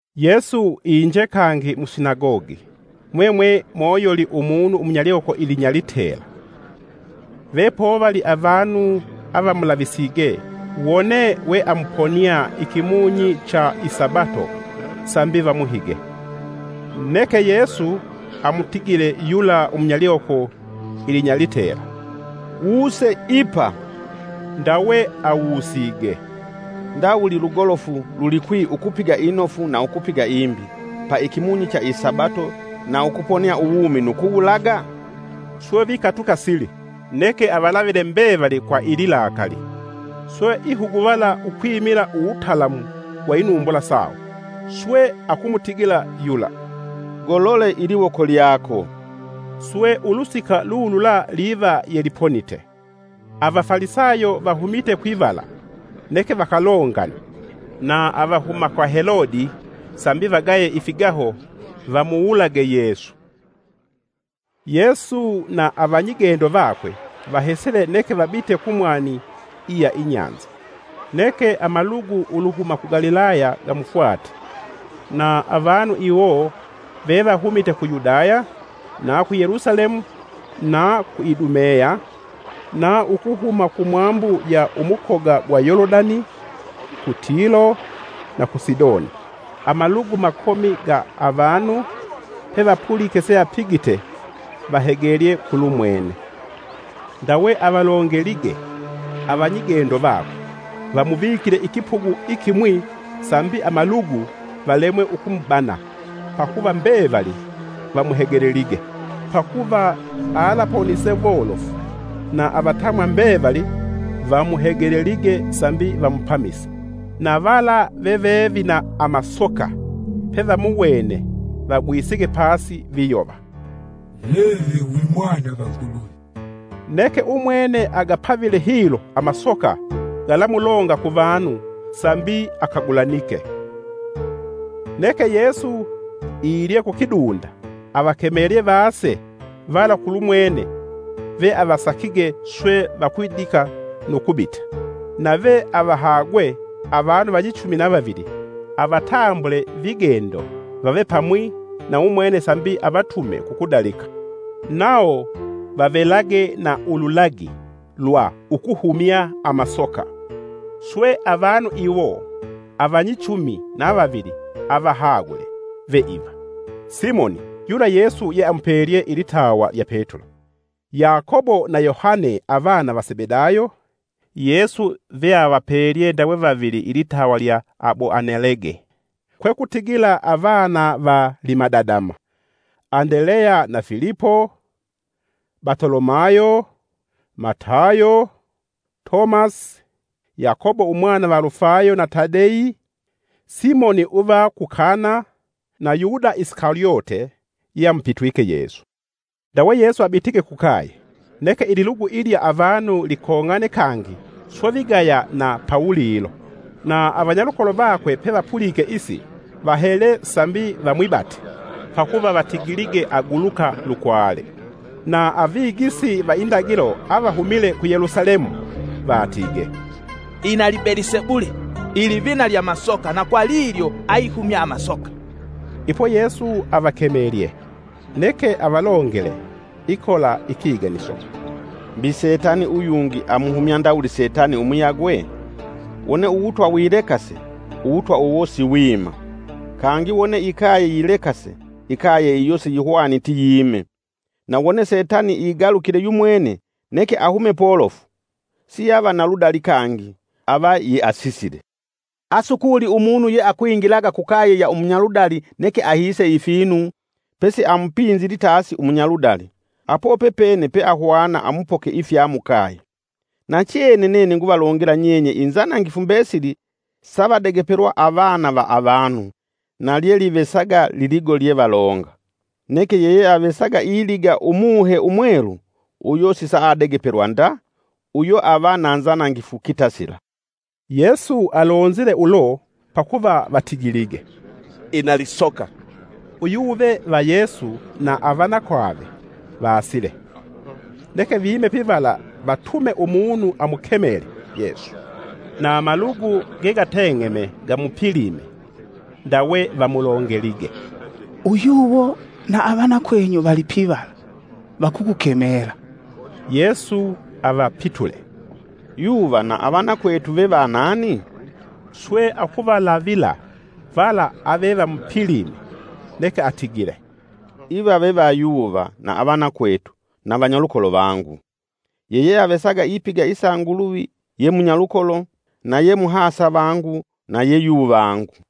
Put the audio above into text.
Yesu ingile kangi musinagogi, mwemwe moyoli umunu umunyaliwoko ilinyalitela. Vepovali avanu avamulavisige, wone weamuponia ikimunyi cha isabato sambi vamuhige. Neke Yesu amutigile yula umunyaliwoko ilinyalitela, “Wuse ipa.” Ndawe awusige, “Ndawuli lugolofu lulikwi ukupiga inofu na ukupiga imbi, pa ikimunyi cha isabato na ukuponia uwumi nu kuwulaga?” Swe vikatuka sili. Neke avalavile mbevali kwa ililakali swe ihuguvala ukwimila uwutalamu wa inumbula sawo, swe akumutigila yula, “Golole iliwoko lyako!” Swe ulusika lulula liva yeliponite. Avafalisayo vahumite kwivala, neke vakalongane na avahuma kwa Helode sambi vagahe ifigaho vamuwulage Yesu. Yesu na avanyigendo vakwe vahesile neke vabite kumwani iya inyanza. Neke amalugu uluhuma ku Galilaya gamufwate. Na avanu iwo vevahumite ku Yudaya, na ku Yelusalemu na ku Idumeya na ukuhuma kumwambu ya umukoga gwa Yolodani ku Tilo na ku Sidoni, amalugu makomi ga avanu pevapulike seapigite vahegelye kulumwene. Ndawe avalongelige avanyigendo vakwe vamuvikile ikipugu ikimwi sambi amalugu valemwe ukumubana pakuva mbevali vamuhegelelige. Pakuva alaponise wolofu na avatamwa mbevali vamuhegelelige sambi vamupamise. Na vala veve vina amasoka pevamuwene vagwisige pasi viyova, “Veve wi Mwana va Nguluvi!” Neke umwene agapavile hilo amasoka galamulonga ku vanu sambi akagulanike. Neke Yesu iilye kukidunda, avakemelye vaase vala kulumwene ve avasakige swe vakwidika nu kubita. Nave avahagwe avanu vanyichumi na vavili avatambule vigendo vave pamwi na umwene sambi avatume kukudalika, nawo vavelage na ululagi lwa ukuhumya amasoka. Swe avanu iwo avanyichumi na vavili avahagule ve iva: Simoni (yula Yesu ye amupelye ilitawa lya Petulo) Yakobo na Yohane avana va Sebedayo (Yesu veavapelye ndawe vavili ilitawa lya Aboanelege, kwekutigila avana va limadadama.) Andeleya na Filipo, Batolomayo, Matayo, Tomasi, Yakobo umwana va Alufayo na Tadeyi, Simoni uva ku Kana na Yuda Isikalyote ye amupitwike Yesu. Ndawe Yesu abitige kukaye. Neke ililugu ilya avanu likong'ane kangi swe vigaya na pawulilo. Na avanyalukolo vakwe pevapulike isi, vahele sambi vamwibate, pakuva vatigilige, aguluka lukwale. Na avigisi va indagilo avahumile ku Yelusalemu vatige, “Ina Libelisebuli! Ilivina lya amasoka na kwa lilyo aihumya amasoka.” Ipo Yesu avakemelye, neke avalongele ikola ikiganiso, “Mbi setani uyungi amuhumya ndawuli Setani umuyagwe? Wone uwutwa wilekase, uwutwa uwo siwima. Kangi wone ikaye yilekase, ikaye iyo siyihwaniti yime. Na wone setani igalukile yumwene neke ahume polofu, siava na ludali kangi, ava ye asisile. “Asukuli umunu yeakwingilaga kukaye ya umunyaludali neke ahiise ifinu, pesiamupinzili tasi umunyaludali, apo pepene peahwana amupoke ifya mukaye. “Nachene nene nguvalongela nyenye inzanangifu mbesili savadegepelwa avana va avanu, na lyelivesaga liligo lyevalonga. Neke yeyeavesaga iliga Umuhe Umwelu uyo sisaadegepelwa nda, uyo ava na nzanangifu kitasila.” ( Yesu alonzile ulo pakuva vatigilige, “Ina lisoka.”) Uyuve va Yesu na avanakwave vaasile, neke vime pivala vatume umunu amukemele Yesu. Na amalugu gegateng'eme gamupilime, ndawe vamulongelige, “Uyuwo na avanakwenyu vali pivala, vakukukemela.” Yesu avapitule, “Yuva na avanakwetu veva nani?” Swe akuvalavila vala avevamupilime neke atigile, “Iva vevayuva na avanakwetu na vanyalukolo vangu! Yeyeavesaga ipiga isa Nguluvi ye munyalukolo, na ye muhasavangu na ye yuvangu.”